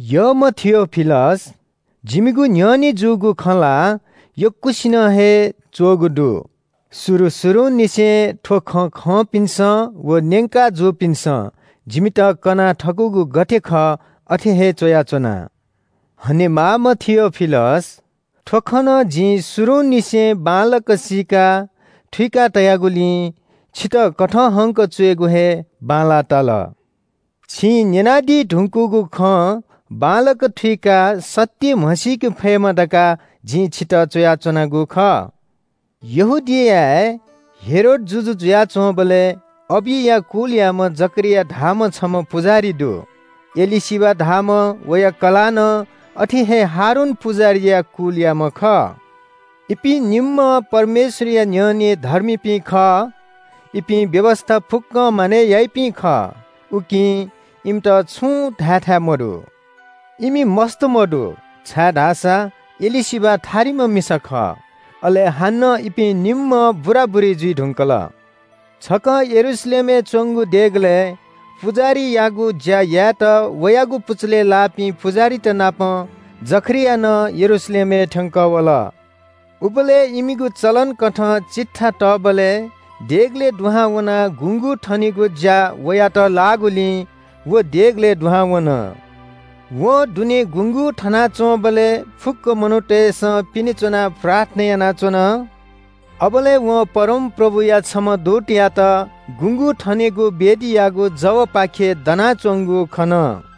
यःम्‍ह थियोफिलस, जिमिगु न्‍ह्यःने जूगु खँ ला यक्‍वसिनं हे च्‍वःगु दु। शुरु शुरुंनिसें थ्‍व खँ खंपिन्‍सं व न्‍यंका जूपिन्‍सं जिमित कना थकूगु गथे खः अथे हे च्‍वयाच्‍वना। हनेमाःम्‍ह थियोफिलस, थ्‍व खँ नं जिं शुरुंनिसें बांलाक सीका थुइका तयागुलिं छितः कथंहंक च्‍वयेगु हे बांलाः ताल। छिं न्‍यनादी धुंकूगु खँ बांलाक थुइकाः सत्‍य म्‍हसीके फयेमा धकाः जिं छितः च्‍वयाच्‍वनागु खः। यहूदियाय् हेरोद जुजु जुयाच्‍वंबलय् अबिया कुलयाम्‍ह जकरिया धाःम्‍ह छम्‍ह पुजाहारी दु। एलीशिबा धाःम्‍ह वया कलाः नं अथे हे हारून पुजाहारीया कुलयाम्‍ह खः। इपिं निम्‍हं परमेश्‍वरया न्‍ह्यःने धर्मीपिं खः। इपिं व्‍यवस्‍था फुक्‍कं मानय् याइपिं खः। उकिं इमित छुं धायेथाय् मदु। इमि मस्‍त मदु, छाय्‌धाःसा एलीशिबा थारिम्‍ह मिसा खः। अले हानं इपिं निम्‍हं बुराबुरी जुइ धुंकल। छकः यरूशलेमय् च्‍वंगु देगलय् पुजाहारीयागु ज्‍या यायेत वयागु पुचलय् लाःपिं पुजाहारीतनापं जकरिया नं यरूशलेमय् थ्‍यंकः वल। उबलय् इमिगु चलन कथं चिट्ठा तःबलय् देगलय् दुहां वनाः गुँगू थनेगु ज्‍या वयात लाःगुलिं व देगलय् दुहां वन। वं दुने गुँगू थनाच्‍वंबलय् फुक्‍क मनूतय्‌सं पिने च्‍वनाः प्रार्थना यानाच्‍वन। अबलय् वं परमप्रभुया छम्‍ह दूतयात गुँगू थनेगु वेदीयागु जवय्‌पाखे दनाच्‍वंगु खन।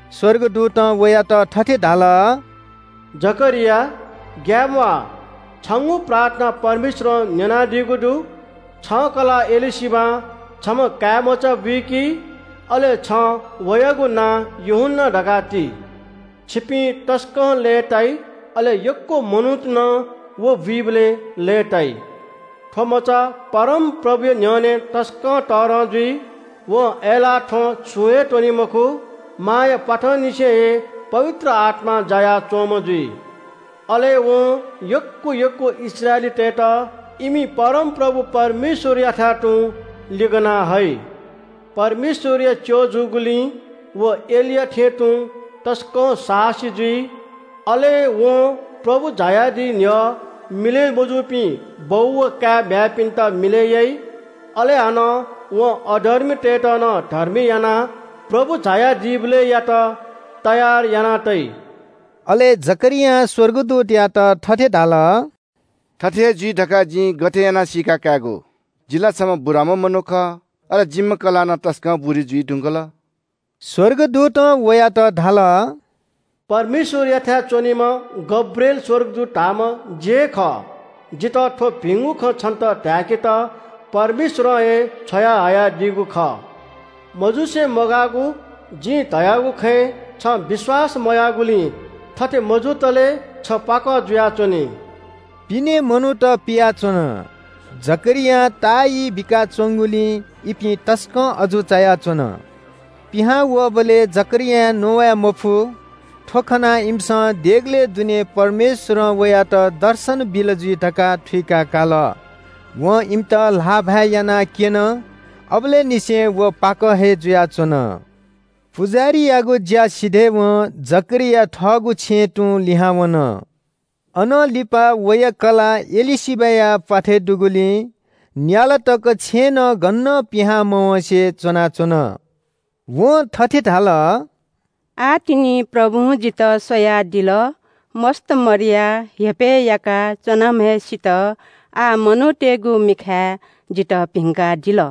स्‍वर्गदूतं वयात थथे धाल – “जकरिया, ग्‍याये म्‍वाः, छंगु प्रार्थना परमेश्‍वरं न्‍यनादीगु दु। छं कलाः एलीशिबां छम्‍ह काय्‌मचा बुइकी, अले छं वयागु नां यूहन्‍ना धकाः ति। छिपिं तसकं लय्‌ताइ। अले यक्‍व मनूत नं व बुइबलय् लय्‌ताइ। थ्‍व मचा परमप्रभुया न्‍ह्यःने तसकं तःधं जुइ। वं अय्‌लाः थ्‍वँ छुं हे त्‍वनी मखु। मांया प्‍वाथंनिसें हे पवित्र आत्‍मां जायाच्‍वंम्‍ह जुइ। अले वं यक्‍व यक्‍व इस्राएलीतय्‌त इमि परमप्रभु परमेश्‍वरयाथाय् तुं लिगना हइ। परमेश्‍वरया च्‍यः जूगुलिं व एलिया थें तुं तसकं साहसी जुइ। अले वं प्रभु झायादी न्‍ह्यः मिलय् मजूपिं बौ व काय् म्‍ह्याय्‌पिन्‍त मिलय् याइ। अले हानं वं अधर्मीतय्‌त नं धर्मी यानाः प्रभु झाया दीबलय्‌यात तयार याना तइ।” अले जकरियां स्‍वर्गदूतयात थथे धाल – “थथे हे जुइ धकाः जिं गथे यानाः सीका कायेगु? जि ला छम्‍ह बुराम्‍ह मनू खः, अले जिम्‍ह कलाः नं तसकं बुरी जुइ धुंकल।” स्‍वर्गदूतं वयात धाल – “परमेश्‍वरयाथाय् च्‍वनीम्‍ह गब्रिएल स्‍वर्गदूत धाःम्‍ह जि हे खः। जितः थ्‍व भिंगु खँ छन्‍त धाय्‌केत परमेश्‍वरं हे छ्वयाहयादीगु खः। मजुसे मगाःगु जिं धयागु खँय् छं विश्‍वास मयाःगुलिं थथे मजुतले छ पाकः जुयाच्‍वनी।” पिने मनूत पियाच्‍वन। जकरियां ताःई बिकाच्‍वंगुलिं इपिं तसकं अजू चायाच्‍वन। पिहां वःबलय् जकरियां नवाय् मफु। थ्‍व खनाः इमिसं देगलय् दुने परमेश्‍वरं वयात दर्शन बिल जुइ धकाः थुइकाकाल। वं इमित ल्‍हाःभाय् यानाक्‍यन। अबलय् निसें व पाकः हे जुयाच्‍वन। पुजाहारीयागु ज्‍या सिधय्‌वं जकरिया थःगु छेँय् तुं लिहां वन। अनं लिपा वया कलाः एलीशिबाया प्‍वाथय् दुगुलिं न्‍याला तक छेँनं गनं पिहां मवँसें च्‍वनाच्‍वन। वं थथे धाल – “आः तिनि प्रभुं जितः स्‍वयादिल। मस्‍त मदयाः हेपय् याका च्‍वनाम्‍हय्‌सित आः मनूतय्‌गु मिखाय् जितः भिंकादिल।”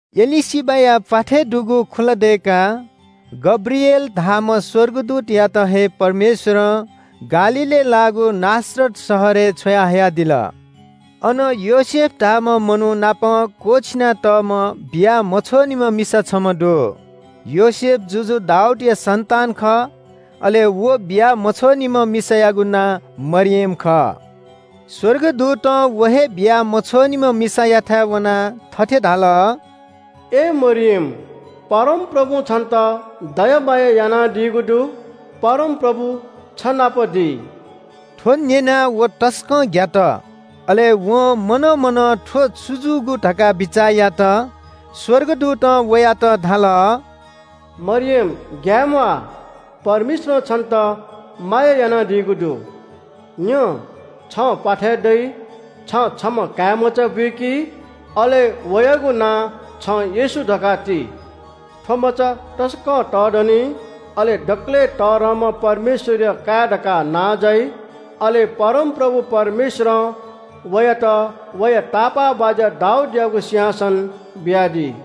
एलीशिबाया प्‍वाथय् दुगु खुला दय्‌काः गब्रिएल धाःम्‍ह स्‍वर्गदूतयात हे परमेश्‍वरं गालीलय् लाःगु नासरत शहरय् छ्वयाहयादिल। अन योसेफ धाःम्‍ह मनू नाप क्‍वःछिना तःम्‍ह बिया मछ्वःनिम्‍ह मिसा छम्‍ह दु। योसेफ जुजु दाऊदया सन्‍तान खः। अले व बिया मछ्वःनिम्‍ह मिसायागु नां मरियम खः। स्‍वर्गदूतं व हे बिया मछ्वःनिम्‍ह मिसायाथाय् वनाः थथे धाल – “अय् मरियम, परमप्रभुं छन्‍त दया माया यानादीगु दु। परमप्रभु छ नाप दी।” थ्‍व न्‍यनाः व तसकं ग्‍यात। अले वं मनं मनं थ्‍व छु जूगु धकाः बिचाः यात। स्‍वर्गदूतं वयात धाल – “मरियम ग्‍याये म्‍वाः, परमेश्‍वरं छन्‍त माया यानादीगु दु। न्‍यँ, छं प्‍वाथय् दइ। छं छम्‍ह काय्‌मचा बुइकी। अले वयागु नां छं येशू धकाः ति। थ्‍व मचा तसकं तःधनी, अले दकलय् तःधंम्‍ह परमेश्‍वरया काय् धकाः नां जाइ। अले परमप्रभु परमेश्‍वरं वयात वया तापाःबाज्‍या दाऊदयागु सिंहासन बियादी।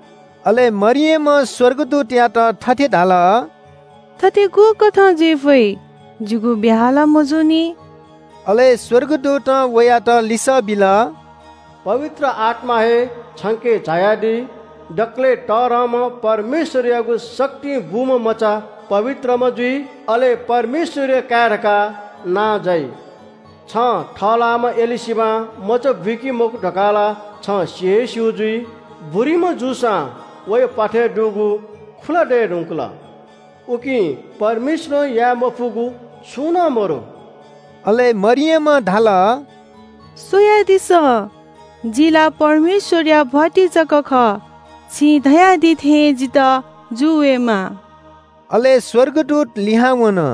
अले मरियमं स्‍वर्गदूतयात थथे धाल – “थथे गुकथं जुइ फइ? जिगु ब्‍याहा ला मजूनि।” अले स्‍वर्गदूतं वयात लिसः बिल – “पवित्र आत्‍मा हे छंके झायादी। दकलय् तःधंम्‍ह परमेश्‍वरयागु शक्तिं बूम्‍ह मचा पवित्रम्‍ह जुइ, अले परमेश्‍वरया काय् धकाः नां जाइ। छं थःलाःम्‍ह एलीशिबां मचा बुइकी मखु धकाः ला छं सि हे स्‍यू जुइ। बुरीम्‍ह जूसां वया प्‍वाथय् दुगु खुला दये धुंकल। उकिं परमेश्‍वरं याये मफुगु छुं नं मदु।” अले मरियमं धाल – “स्‍वयादिसँ, जि ला परमेश्‍वरया भ्‍वातिं जक खः। छिं धयादी थें हे जितः जू वयेमा।” अले स्‍वर्गदूत लिहां वन।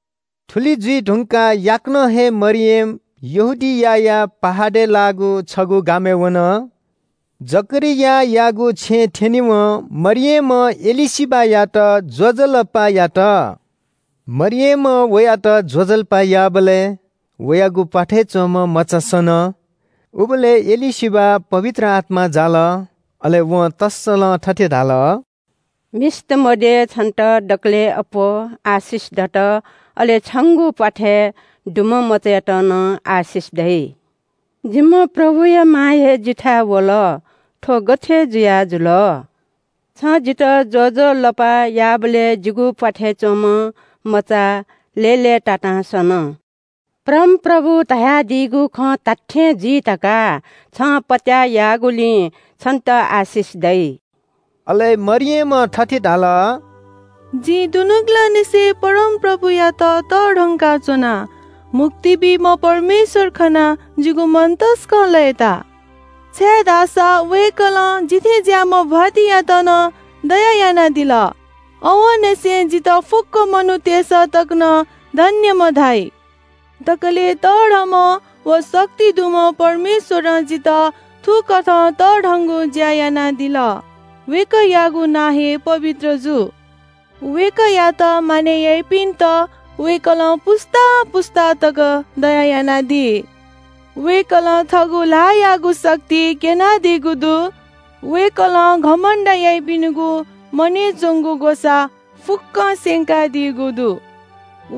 थुलि जुइ धुंकाः याकनं हे मरियम यहूदियाया पहाडय् लाःगु छगू गामय् वन। जकरियायागु छेँय् थ्‍यनेवं मरियमं एलीशिबायात ज्‍वजलपा यात। मरियमं वयात ज्‍वजलपा याःबलय् वयागु प्‍वाथय् च्‍वंम्‍ह मचा सन। उबलय् एलीशिबा पवित्र आत्‍मां जाल। अले वं तःसलं थथे धाल – “मिस्‍त मध्‍ये छन्‍त दकलय् अप्‍वः आशिष दत अले छंगु प्‍वाथय् दुम्‍ह मचायात नं आशिष दइ। जिम्‍ह प्रभुया मां हे जिथाय् वल। थ्‍व गथे जुयाजुल? छं जितः ज्‍वजलपा याःबलय् जिगु प्‍वाथय् च्‍वंम्‍ह मचा लय्‌लय्‌तातां सन। परमप्रभुं धयादीगु खँ धात्‍थें जुइ धकाः छं पत्‍याः याःगुलिं छन्‍त आशिष दइ।” अले मरियमं थथे धाल – “जिं दुनुगलंनिसें परमप्रभुयात तःधंकाच्‍वना। मुक्ति बीम्‍ह परमेश्‍वर खनाः जिगु मन तसकं लय्‌ताः, छाय्‌धाःसा वय्‌कलं जि थज्‍याःम्‍ह भ्‍वातिंयात नं दया यानादिल। आवंनिसें जितः फुक्‍क मनूतय्‌सं तक नं धन्‍यम्‍ह धाइ। दकलय् तःधंम्‍ह व शक्ति दुम्‍ह परमेश्‍वरं जितः थुकथं तःधंगु ज्‍या यानादिल। वय्‌कःयागु नां हे पवित्र जू। वय्‌कःयात मानय् याइपिन्‍त वय्‌कलं पुस्‍ता पुस्‍तां तकं दया यानादी। वय्‌कलं थःगु ल्‍हाःयागु शक्ति क्‍यनादीगु दु। वय्‌कलं घमण्‍ड याइपिनिगु मनय् च्‍वंगु ग्‍वसाः फुक्‍कं स्‍यंकादीगु दु।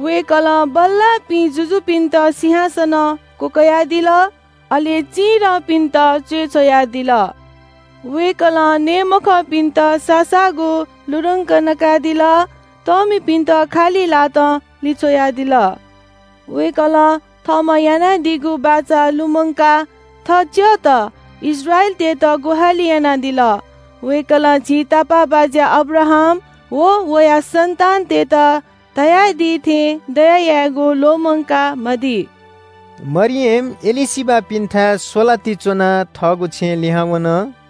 वय्‌कलं बल्‍लाःपिं जुजुपिन्‍त सिंहासनं क्‍वकयादिल, अले चिधंपिन्‍त च्‍वय् छ्वयादिल। वय्‌कलं नये मखंपिन्‍त साःसाःगु लुधंक नकादिल। तःमिपिन्‍त खालि ल्‍हातं लिछ्वयादिल। वय्‌कलं थःम्‍हं यानादीगु बाचा लुमंकाः थः च्‍यःत इस्राएलीतय्‌त ग्‍वाहालि यानादिल। वय्‌कलं झी तापाःबाज्‍या अब्राहाम व वया सन्‍तानतय्‌त धयादी थें दया यायेगु ल्‍वःमंका मदी।” मरियम एलीशिबापिन्‍थाय् स्‍वलाति च्‍वनाः थःगु छेँय् लिहां वन।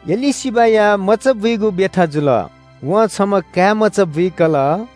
एलीशिबाया मचाबुइगु ब्‍यथा जुल। वं छम्‍ह काय्‌मचा बुइकल।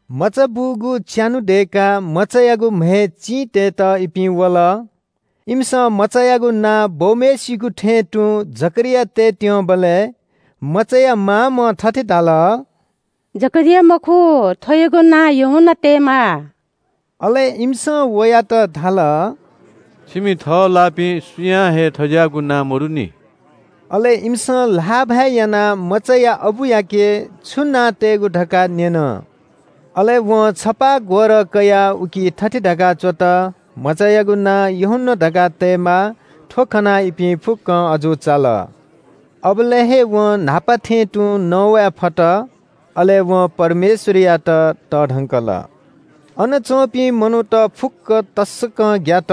मचा बूगु च्‍यान्‍हु दय्‌काः मचायागु म्‍हय् चिं तयेत इपिं वल। इमिसं मचायागु नां बौम्‍हय्‌सिगु थें तुं जकरिया तयेत्‍यंबलय् मचाया मामं थथे धाल – “जकरिया मखु, थ्‍वयागु नां यूहन्‍ना तयेमाः।” अले इमिसं वयात धाल – “छिमि थःलाःपिं सुयां हे थज्‍याःगु नां मदुनि।” अले इमिसं ल्‍हाःभाय् यानाः मचाया अबुयाके छु नां तयेगु धकाः न्‍यन। अले वं छपाः ग्‍वरः कयाः उकी थथे धकाः च्‍वत – “मचायागु नां यूहन्‍ना धकाः तयेमाः।” थ्‍व खनाः इपिं फुक्‍कं अजू चाल। अबलय् हे वं न्‍हापा थें तुं नवाये फत। अले वं परमेश्‍वरयात तःधंकल। अन च्‍वंपिं मनूत फुक्‍कं तसकं ग्‍यात।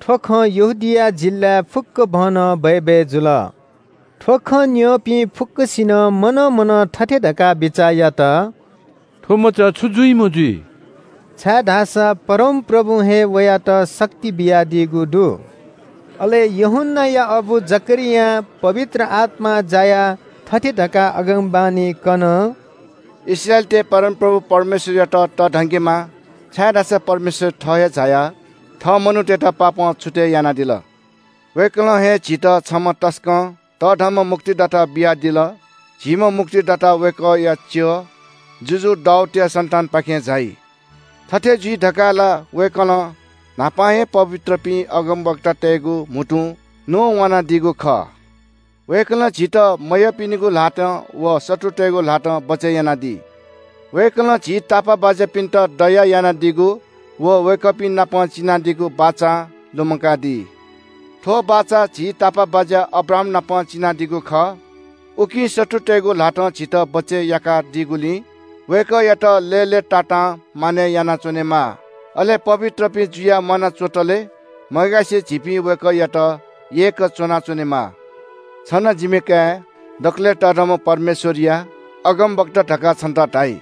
थ्‍व खँ यहूदिया जिल्‍लाय् फुक्‍कभनं बय्‌बय् जुल। थ्‍व खँ न्‍यंपिं फुक्‍कसिनं मनं मनं थथे धकाः बिचाः यात – “थ्‍व मचा छु जुइम्‍ह जुइ?” छाय्‌धाःसा परमप्रभुं हे वयात शक्ति बियादीगु दु। अले यूहन्‍नाया अबु जकरियां पवित्र आत्‍मां जायाः थथे धकाः अगमवाणी कन – “इस्राएलीतय् परमप्रभु परमेश्‍वरयात तःधंकेमा, छाय्‌धाःसा परमेश्‍वर थः हे झायाः थः मनूतय्‌त पापं छुतय् यानादिल। वय्‌कलं हे झीत छम्‍ह तसकं तःधंम्‍ह मुक्तिदाता बियादिल। झीम्‍ह मुक्तिदाता वय्‌कःया च्‍यः जुजु दाऊदया सन्‍तानपाखें झाइ। थथे जुइ धकाः ला वय्‌कलं न्‍हापा हे पवित्रपिं अगमवक्तातय्‌गु म्‍हुतुं न्‍ववानादीगु खः। वय्‌कलं झीत मयःपिनिगु ल्‍हातं व शत्रुतय्‌गु ल्‍हातं बचय् यानादी। वय्‌कलं झी तापाःबाज्‍यापिन्‍त दया यानादीगु व वय्‌कःपिं नाप चिनादीगु बाचा लुमंकादी। थ्‍व बाचा झी तापाःबाज्‍या अब्राहामनाप चिनादीगु खः। उकिं शत्रुतय्‌गु ल्‍हातं झीत बचय् याका दीगुलिं वय्‌कःयात लय्‌लय्‌तातां मानय् यानाच्‍वनेमा। अले पवित्रपिं जुयाः म्‍वाना च्‍वंतले मग्‍यासे झीपिं वय्‌कःयात यय्‌क च्‍वनाच्‍वनेमा। छ नं, जिमि काय्, दकलय् तःधंम्‍ह परमेश्‍वरया अगमवक्ता धकाः छन्‍त धाइ।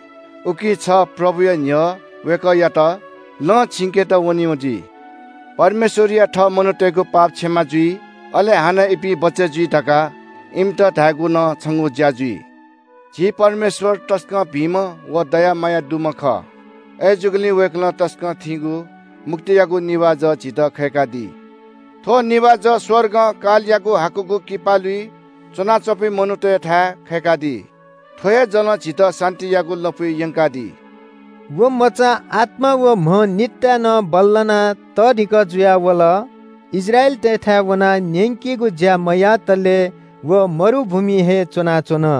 उकिं छ प्रभुया न्‍ह्यः वय्‌कःयात लँ छिंकेत वनीम्‍ह जुइ। परमेश्‍वरया थःमनूतय्‌गु पाप क्षमा जुइ, अले हानं इपिं बचय् जुइ धकाः इमित धायेगु नं छंगु ज्‍या जुइ। झी परमेश्‍वर तसकं भिंम्‍ह व दया माया दुम्‍ह खः। अय्‌जूगुलिं वय्‌कलं तसकं थीगु मुक्तियागु निभाः जः झीत खय्‌कादी। थ्‍व निभाः जः स्‍वर्गं कालयागु हाकुगु किपालुइ च्‍वनाच्‍वंपिं मनूतय्‌थाय् खय्‌कादी। थ्‍व हे जलं झीत शान्‍तियागु लँपुइ यंकादी।” व मचा आत्‍मा व म्‍ह निताय् नं बल्‍लानाः तःधिकः जुयावल। इस्राएलीतय्‌थाय् वनाः न्‍यंकेगु ज्‍या मयातले व मरुभूमिइ हे च्‍वनाच्‍वन।